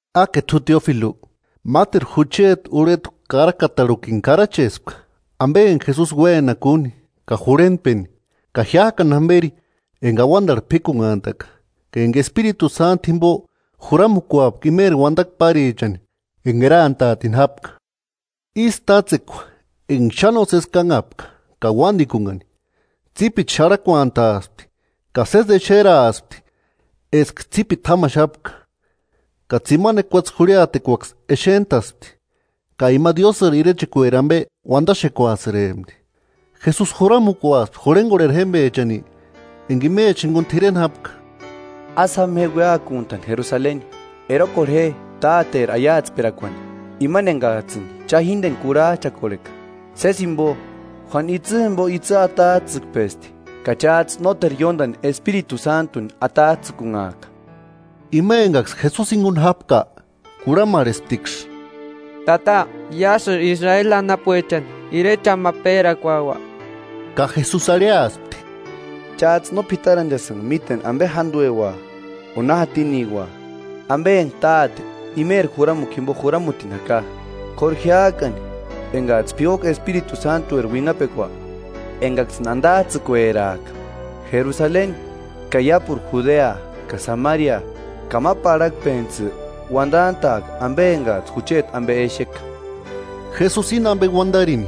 ¡Áke t'u Teófilu! Máteru jucheti urhetku karakatarhukini karachespka ampe enka Jesusi uénapka úni ka jurhentpeni. Ka jiák'ani jamperi enka auantarhu p'íkunhantaka, ka enka Espiritu Sántu jimpo juramukuapka imeri uantakua párichani enka erantaatini jápka. Ísï tátsekua enka xáni nósesi kánhapka ka uántikunhani, tsípiti xarhakuantaaspti ka sési exeraaspti eska tsípiti jámaxapka, ka tsimani ekuatse jurhiatekuaksï exent'aspti, ka ima Diósïri irechakueri ampe uantaxekuasïrempti. Jesusi juramukuaspti jurhenkorheri jémpechani enka imechani jinkuni t'ireni jápka: –Ásï jama je uéakuntani Jerusaleni. Erokorhe je Táteri aiatsperakuani, imani enkats'ïni cha jínteni kurhach'akorheka. Sési jimpo, Juánu itsï jimpo itsï atats'ïkpesti, ka cháts'ï nóteru ióntani Espiritu Sántuni atats'ïkunhaaka. Ima enkaksï Jesusi jinkuni jápka, kurhamarhesptiksï: –Tata, ¿Iásïri Israeli anapuechani irecheni ma péraakuaua? Ka Jesusi arhiaspti: –Cháts'ï no p'itaranchasïnka míteni ampe jántueua o na jatiniua, ampe enka Táte imeri juramukua jimpo juramutini jaka, k'óru jiák'ani enkats'ï p'iuaka Espiritu Sántueri uinhapekua, enkaksïni antats'ïkueraaka, Jerusaleni ka iápuru Judea ka Samaria ka ma parhakpentsï uantant'a'aka ampe enkats'ï jucheti ampe exeka. Jesusi íni ampe untarini,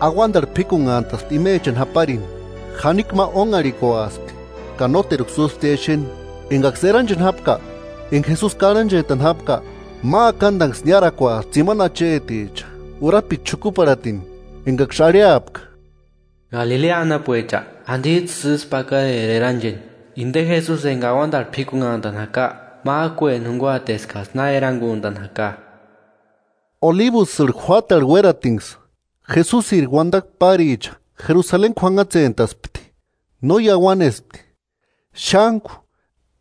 auantarhu p'íkunhantaspti imechani jáparini, jánikua ma ónharhikuaspti ka nóteruksï úsptiia exeni. Enkaksï erancheni jápka, enka Jesusi karhanchent'ani jápka, ma akantanksï niárakuaspti tsimani acheticha urapiti xukuparhatini, enkaksï arhiapka: –Galilea anapuecha, ¿Antits'ïsï ísku pakarera erancheni? Inte Jesusi enka auantarhu p'íkunhantani jaka, mák'ueni junkuaati eskats'ï na erankuntani jaka. Olibusïrhu juátarhu uératinksï, Jesusiri uantakua páricha Jerusaleni k'uanhatsentaspti, no iauanesti, xántku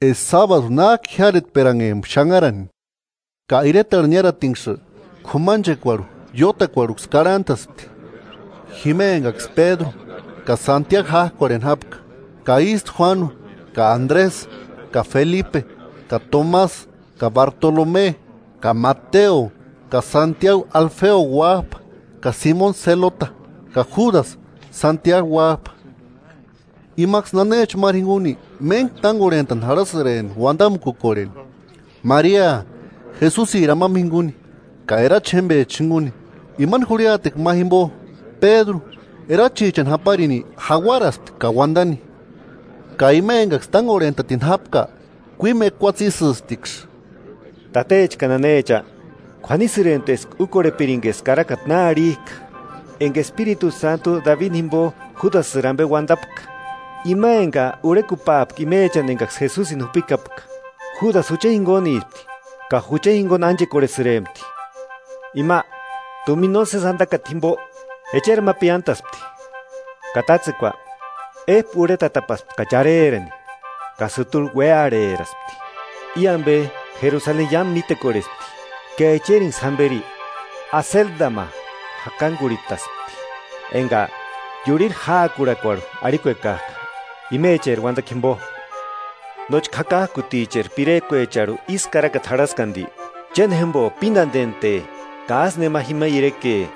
eska sábadu nák'u jiáretperanhempka xanharani. Ka iretarhu niáratinksï, k'umanchekuarhu iótakuarhuksï karhantaspti, jima enkaksï Pédru ka Santiagu ják'orheni jápka, ka ístu Juánu ka Andresï ka Felipe ka Tomasï ka Bartolome ka Mateo ka Santiagu Alfeo uáp'a, ka Simoni Selota ka Júdasï; Santiagu uáp'a. Imaksï nanecha máru jinkuni méntku tánkorhent'ani jarhasïrempti uantamukukorheni, Maria Jesusiri amampa jinkuni ka erachi jémpecha jinkuni. Imani jurhiatekua ma jimpo, Pédru, erachichani japarini jauarasti ka uantaspti. Ka ima enkaksï tánkorhetini jápka kuímu ekuatse ísïptiksï: “Tatecha ka nanecha, k'uanisïrempti eska úkorhepirinka eska karakata na arhik'a, enka Espiritu Sántu Dabini jimpo, Júdasïri ampe uantapka. Ima enka urhekupaapka imechani enkaksï Jesusini jupikapka. Júdasï jucha jinkunispti ka jucha jinkuni ánchekorhesïrempti. Ima, tumina nósesi antakata jimpo, echeri ma piántaspti, ka tátsekua ép'u urhetatapaspti ka charerani ka sïturhi uéarheraspti. I ampe Jerusaleni iámu mítekorhespti ka echerinksï jamperi Aseldama jakankurhitaspti, (enka ‘Iurhiri jáakurhakuarhu’ arhikuekak'a imecheri uantakua jimpo.) Nóchka jakak'uticheri pirekuecharhu ísï karakata jarhasti anti: Chéni jémpo pínantente, ka ásteru nema jima ireke.”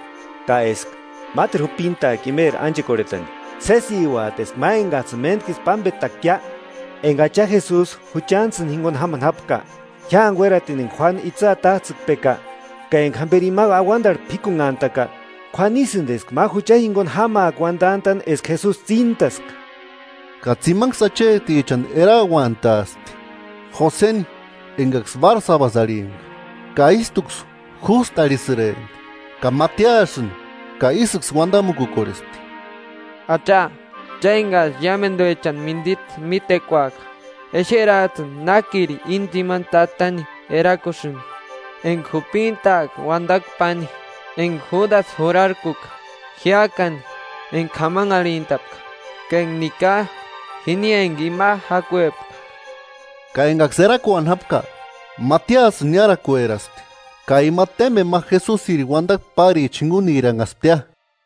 Ka eska máteru jupintaaka imeri ánchekorhetani. “Sésiuati eska ma enkats'ïni méntkisï pámpetakiia, enka Acha Jesusi juchantsïni jinkuni jámani jápka; jiáni uératini enka Juánu itsï atats'ïkpeka, ka enka jamperi ima auantarhu p'íkunhantaka. K'uanisïnti eska ma jucha jinkuni jámaaka uantant'a'ni eska Jesusi tsíntaska.” Ka tsimanksï achetichani erauantaaspti: Joseni, enkaksï Bársabasï arhimpka ka ístuksï Jústu arhisïrempti, ka Matiasïni. Ka ísïksï uantamukukorhespti: “Acha, cha enkats'ï iámentuechani mintsita mítekuaka, exerats'ïni nákiri i tsimani tatani erakusïnki, enka jupintaaka uantakua páni, enka Júdasï jurarkuka jiák'ani enka k'amanharhint'apka, ka enka nika jini enka ima jakuepka.” Ka enkaksï erakuani jápka, Matiasïni niárakueraspti, ka ima témpeni ma Jesusiri uantakua páricha jinkuniranhasptia.